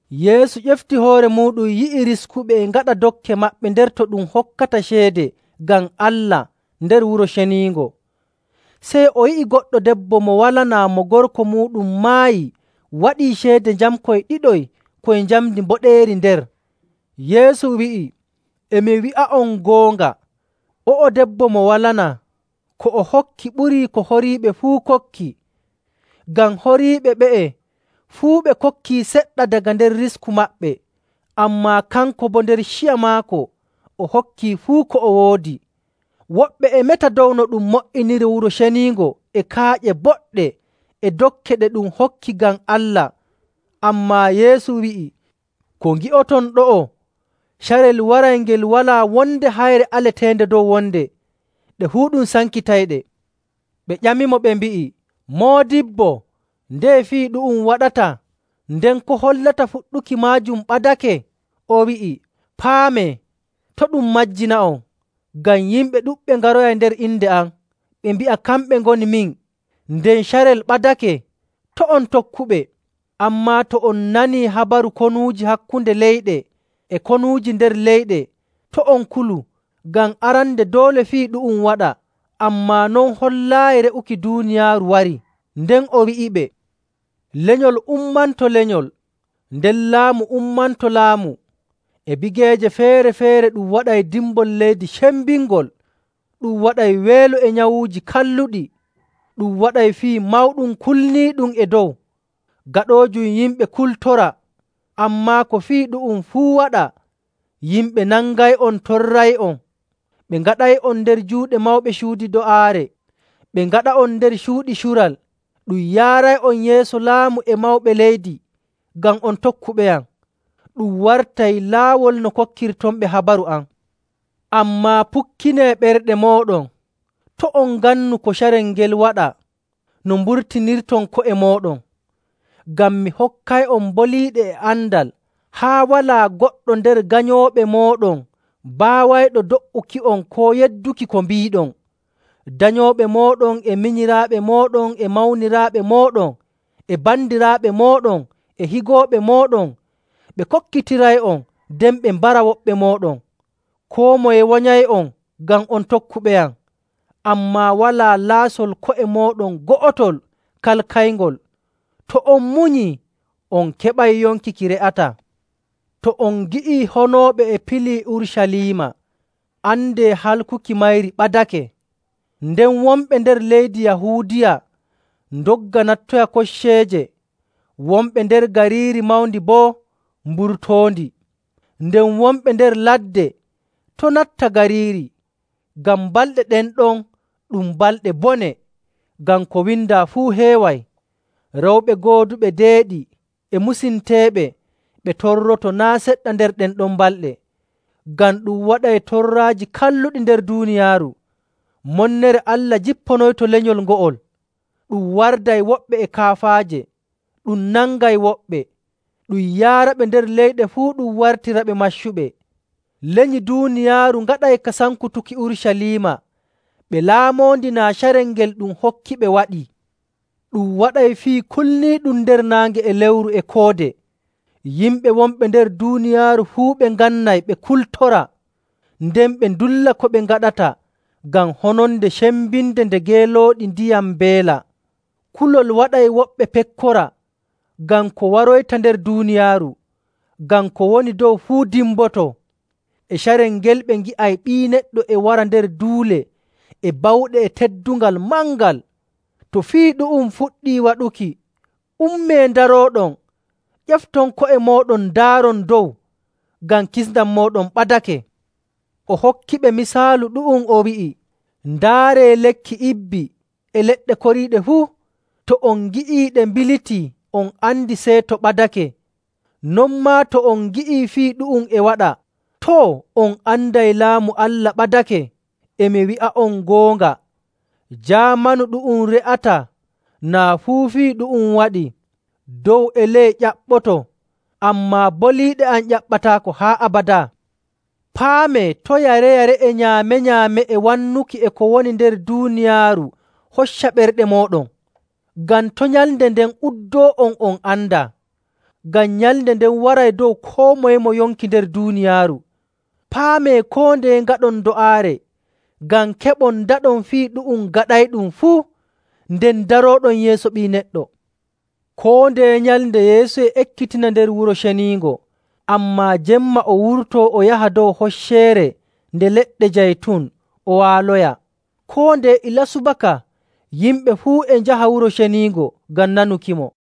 Yeesu ƴefti hoore muuɗum yi'i riskuɓe e ngaɗa dokke maɓɓe nder to ɗum hokkata ceede ngam Allah nder Wuro Ceniingo. Sey o yi'i goɗɗo debbo mo walanaa mo gorko muuɗum maayi waɗii ceede njamkoy ɗiɗoy koy njamndi mboɗeeri nder. Yeesu wi'i, “E mi wi'a'on goonga, o'o debbo mo walanaa, ko o hokki ɓurii ko horiiɓe fuu kokki. Ngam horiiɓe ɓe'e fuu ɓe kokkii seɗɗa daga nder risku maɓɓe, ammaa kanko boo nder ciya maako o hokki fuu ko o woodi.” Woɓɓe e meta dow no ɗum mo''iniri Wuro Ceniingo e kaaƴe boɗɗe e dokke ɗe ɗum hokki ngam Allah. Ammaa Yeesu wi'i, “Ko ngi'oton ɗo'o, carel waray ngel walaa wonde hayre aleteende dow wonde. Ɗe fuu ɗum sankitayɗe.” Ɓe ƴamimo, ɓe mbi'i, “Moodibbo, ndeye fii ɗu'um waɗata? Nden ko hollata fuɗɗuki maajum ɓadake?” O wi'i, “Paamee, to' ɗum majjina'on. Ngam yimɓe ɗuɗɓe ngaroyay nder inde am, ɓe mbi'a kamɓe ngoni min, nden, ‘Carel ɓadake!’ To' on tokkuɓe. Ammaa, to on nanii habaru konuuji hakkunde leyɗe e konuuji nder leyɗe, to' on kulu, ngam arande doole fii ɗu'um waɗa, ammaa non hollaayi re'uki duuniyaaru warii.” Nden o wi'iɓe, “Lenyol ummanto lenyol, nden laamu ummanto laamu. E bigeeje feere‑feere ɗum waɗay dimbol leydi cembingol, ɗum waɗay weelo e nyawuuji kalluɗi. Ɗum waɗay fii mawɗum kulniiɗum e dow, gaɗoojum yimɓe kultora. Ammaa ko fii ɗu'um fuu waɗa, yimɓe nangay'on, torray'on, ɓe ngaɗay'on nder juuɗe mawɓe cuuɗi do'aare, ɓe ngaɗa'on nder cuuɗi cural, ɗum yaaray'on yeeso laamiiɓe e mawɓe leydi, ngam on tokkuɓeyam. Ɗum wartay laawol no kokkirtonɓe habaru am. Ammaa pukkinee ɓerɗe mooɗon, to' on ngannu ko carel ngel waɗa no mburtinirton ko'e mooɗon. Ngam mi hokkay'on boliiɗe e andal, haa walaa goɗɗo nder ganyooɓe mooɗon baawayɗo do''uki'on koo yedduki ko mbiiɗon.. Danyooɓe mooɗon e minyiraaɓe mooɗon e mawniraaɓe mooɗon e bandiraaɓe mooɗon e higooɓe mooɗon, ɓe kokkitiray'on, nden ɓe mbara woɓɓe mooɗon. Koo moye wanyay'on ngam on tokkuɓeyam. Ammaa walaa laasol ko'e mooɗon go'otol kalkayngol. To on munyii, on keɓay yonki ki re'ataa. “To on ngi'ii honooɓe e pilii Urucaliima, andee halkuki mayri ɓadake. Nden wonɓe nder leydi Yahuudiya ndogga nattoya kocceeje, wonɓe nder gariiri mawndi boo mburtoondi, nden wonɓe nder ladde to' natta gariiri. Ngam balɗe ɗen ɗon ɗum ‘Balɗe Bone,’ ngam ko windaa fuu heeway.. Rewɓe gooduɓe deeɗi e musinteeɓe ɓe torroto naa' seɗɗa nder ɗen ɗon balɗe! Ngam ɗum waɗay torraaji kalluɗi nder duuniyaaru, monnere Allah jipponoyto lenyol ngo'ol. Ɗum warday woɓɓe e kaafaaje, ɗum nangay woɓɓe, ɗum yaaraɓe nder leyɗe fuu ɗum wartiraɓe maccuɓe. Lenyi duuniyaaru ngaɗay ka sankutuki Urucaliima ɓe laamoondi naa carel ngel ɗum hokkiɓe waɗii. “Ɗum waɗay fii kulniiɗum nder naange e lewru e koode. Yimɓe wonɓe nder leyɗe duuniyaaru fuu ɓe ngannay ɓe kultora, nden ɓe ndulla ko ɓe ngaɗata ngam hononde cembinde nde geelooɗi ndiyam mbeela.. Kulol waɗay woɓɓe pekkora, ngam ko waroyta nder duuniyaaru, ngam ko woni dow fuu dimboto. E carel ngel, ɓe ngi'ay Ɓii Neɗɗo e wara nder duule e bawɗe e teddungal mangal.. To fii ɗu'um fuɗɗii waɗuki, ummee ndarooɗon, ƴefton ko'e mooɗon ndaaron dow, ngam kisndam mooɗon ɓadake.” O hokkiɓe misaalu ɗu'um, o wi'i, “Ndaaree lekki ibbi e leɗɗe koriiɗe fuu. To on ngi'ii ɗe mbilitii, on andi seeto ɓadake. Non maa to on ngi'ii fii ɗu'um e waɗa, too, on anday Laamu Allah ɓadake. “E mi wi'a'on goonga, jaamanu ɗu'um re'ataa naa fuu fii ɗu'um waɗii. Dow e ley ƴaɓɓoto, ammaa boliiɗe am ƴaɓɓataako haa abadaa. “Paamee to' yare‑yare e nyaame‑nyaame e wannuki e ko woni nder duuniyaaru hocca ɓerɗe mooɗon, ngam to' nyalnde nden uddoo'on on andaa. Ngam nyalnde nden waray dow koo moye mo yonki nder duuniyaaru. Paamee koo ndeye ngaɗon do'aare ngam keɓon ndaɗon fii ɗu'um gaɗayɗum fuu, nden ndarooɗon yeeso Ɓii Neɗɗo.” Koo ndeye nyalnde Yeesu e ekkitina nder Wuro Ceniingo, ammaa jemma o wurtoo o yaha dow Hocceere Nde Leɗɗe Jaytun o waaloya.. Koo ndeye ilaa subaka yimɓe fuu e njaha Wuro Ceniingo ngam nanukimo.